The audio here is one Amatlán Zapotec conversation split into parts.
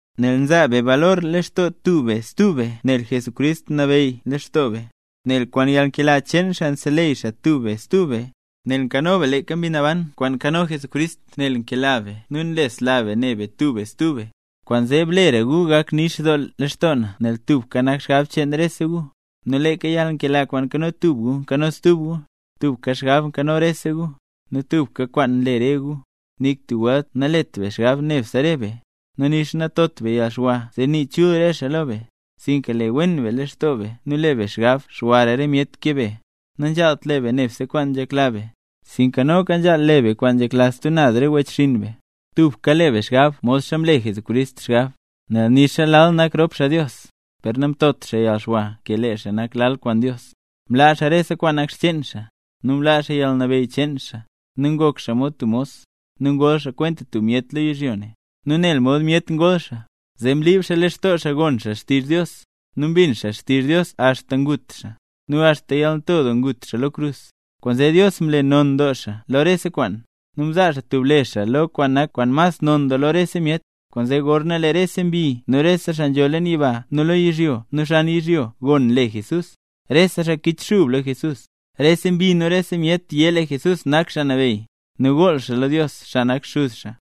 Nel nzaa be balor lextoo tub be stub be nel Jesucrist nabeyy leen lextoo be; nel kwaan yalnkela cheen xaa nseleyy xaa tub be stub be; nel leeka Mbi Naban nzho lextoo be kwaan ngu lextoo Jesucrist; nel nkano be yalnkela, nu nlesla be ne be tub be stub be; kwaanzee, blera gu gak nix doo lextoo na nel tubka nak xgab cheen rese gu, nu leeka yalnkela kwaan nkano tub gu nkano stub gu. Tubka xgab nkano rese gu, nu tubka kwaan nle re gu. Nik tub welt nalet be xgab nebse re be, nu nixa natot be yalxwa zee nii chul re xaa lo be, sinka le wen be lextoo be nu le be xgab xwara re myet ke be. Nanzhaalt le be nebse kwaan nzhekla be sinka noka nzhaal le be kwaan nzhekla stub naz re wechxinn be. Tubka le be xgab modxa mle Jesucrist xgab. Nel nixa lal nak rop xaa Dios, per namtot xaa yalxwa ke lee xaa nak lal kwaan Dios. Mlaa xaa rese kwaan nak xcheen xaa, nu mlaa xaa yalnabeyy cheen xaa, nu ngok xaa mod tub mos, nu ngol xaa kwenta myet lo yizhyo ne. Nu nel mod myet ngol xaa, zee mlib xaa lextoo xaa gon xaa xtizh Dios, nu mbin xaa xtizh Dios axta ngut xaa, nu axta yalnto doo ngut xaa lo krus. Kwaanzee Dios mle non doo xaa lo rese kwaan. Nu mzaa xaa tub le xaa lo xaa kwaan nak kwaan mas non doo lo rese myet. Kwaanzee gorna lee rese mbi nu rese xaa nzho leen yiba nu lo yizhyo nu xan yizhyo gon le Jesús, rese xaa kichxub lo Jesús. Rese mbi nu rese myet yé lee Jesucrist nak Xaa Nabeyy, nu gool xaa lo Dios xaa nak xuz xaa.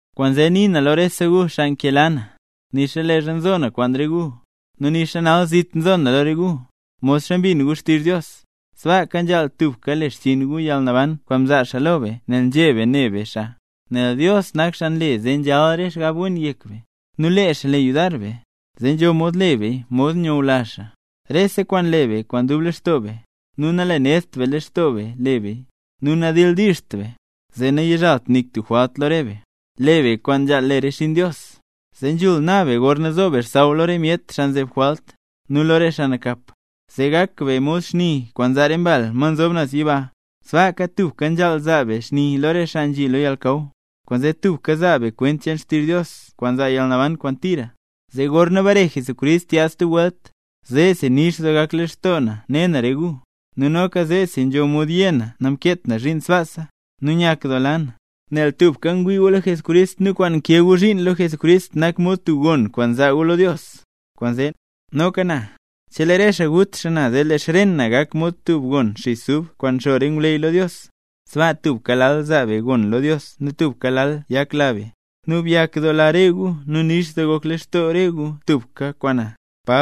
Kwaanzee, nii na lo rese gu xaa nkela na, nixa leezha nzo na kwaan re gu, nu nixa nal zit nzo na lo re gu, modxa mbin gu xtizh Dios, sbaaka nzhaal tubka le xchiin gu yalnaban kwaan mzaa xaa lo be nel nzheb be ne be xaa. Nel Dios nak xaa nle zee nzhal re xgab wen yek be, nu lee xaa le yudar be, zee nzho mod le beya mod nyula xaa. Rese kwaan le be kwaan dub lextoo be, nu nalenedt be lextoo be le beya, nu nadildiizht beya. Zee nayizhalt nik tub jwalt lo re be, le be kwaan nzhaal le re xinn Dios, zee nzhul na be gorna zo be xsaww lo re myet xaa nzeb jwalt, nu lo re xaa nakap. Zee gak be mod xni kwaan nzaa re mbal ma nzob naz yiba; sbaaka tubka nzhaal zaa be xni lo re xaa nzhi lo yalnakaw. Kwaanzee tubka zaa be kwent cheen xtizh Dios kwaan zaa yalnaban kwaan tira. Zee gorna bare Jesucrist yaad stub welt, zeesi nix doo gak lextoo na ne na re gu, nu noka zeesi nzho mod yé na namkeet na zhiin sbaasa. Nu nyakdoola na, nel tubka ngwii gu lo Jesucrist nu kwaan nkee gu zhiin lo Jesucrist nak mod tub gon kwaan zaa gu lo Dios. Kwaanzee, noka na, chelee re xaa gut xaa na zee lee xren na gak mod tub gon xis ub kwaan nxo re ngwleyy lo Dios. Sbaa tubka lal zaa be gon lo Dios nu tubka lal yakla be. Nu byakdoola re gu, nu nix doo gok lextoo re gu tubka kwaan na.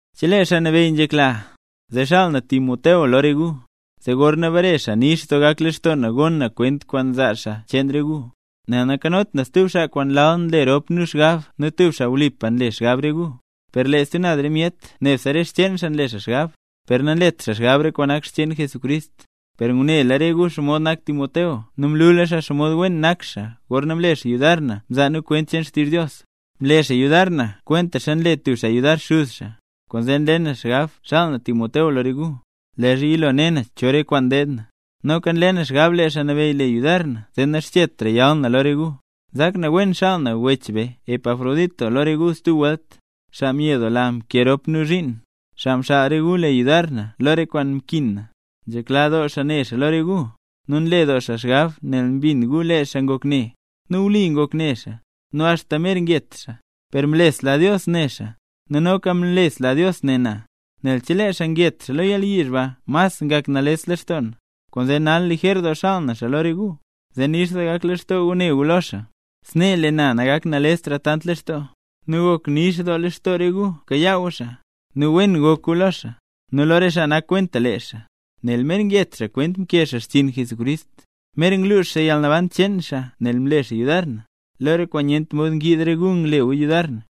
Chelee Xaa Nabeyy nzhekla, zee xaal na Timoteo lo re gu, zee gorna bare xaa nix doo gak lextoo na gon na kwent kwaan zaa xaa cheen re gu. Nel nankanot na stub xaa kwaan lal le rop nu xgab nu tub xaa wlipa nle xgab re gu. Per lee stub naz re myet nebse re xcheen xaa nle xgab, per nanlet xaa xgab re kwaan nak xcheen Jesucrist. Per ngunela re gu xomod nak Timoteo nu mlula xaa xomod wen nak xaa gorna mle xaa yudar na mzaa nu kwent cheen xtizh Dios, mle xaa yudar na kwentaxa nle tub xaa yudar xuz xaa. Kwaanzee nle na xgab xaal na Timoteo lo re gu, leezha yilo ne na cho re kwaan deed na. Noka nle na xgab lee Xaa Nabeyy le yudar na zee naxchetra yal na lo re gu. Nzak na wen xaal na wech be Epafrodito lo re gu stub welt, xaa myedoola mkee rop nu zhiin, xaa mxaal re gu le yudar na lo re kwaan mkin na. Nzhekla doo xaa ne xaa lo re gu, nu nle doo xaa xgab nel mbin gu lee xaa ngok ne. Nu wli ngok ne xaa, nu axta mer nget xaa; per mlesla Dios ne xaa, nu noka mlesla Dios ne na, nel chelee xaa nget xaa lo yalyizh ba mas ngak nales lextoo na. Kwaanzee nal lijer doo xaal na xaa lo re gu, zee nix doo gak lextoo gu ne gu lo xaa, snee lee na nagak nalestra tant lextoo nal. Nu gok nix doo lextoo re gu bkayaa gu xaa, nu wen gok gu lo xaa, nu lo re xaa nak kwenta lee xaa, nel mer nget xaa kwent mkee xaa xchiin Jesucrist. Mer nglux xaa yalnaban cheen xaa nel mle xaa yudar na, lo re kwaan nyent mod ngyiid re gu ngle gu yudar na.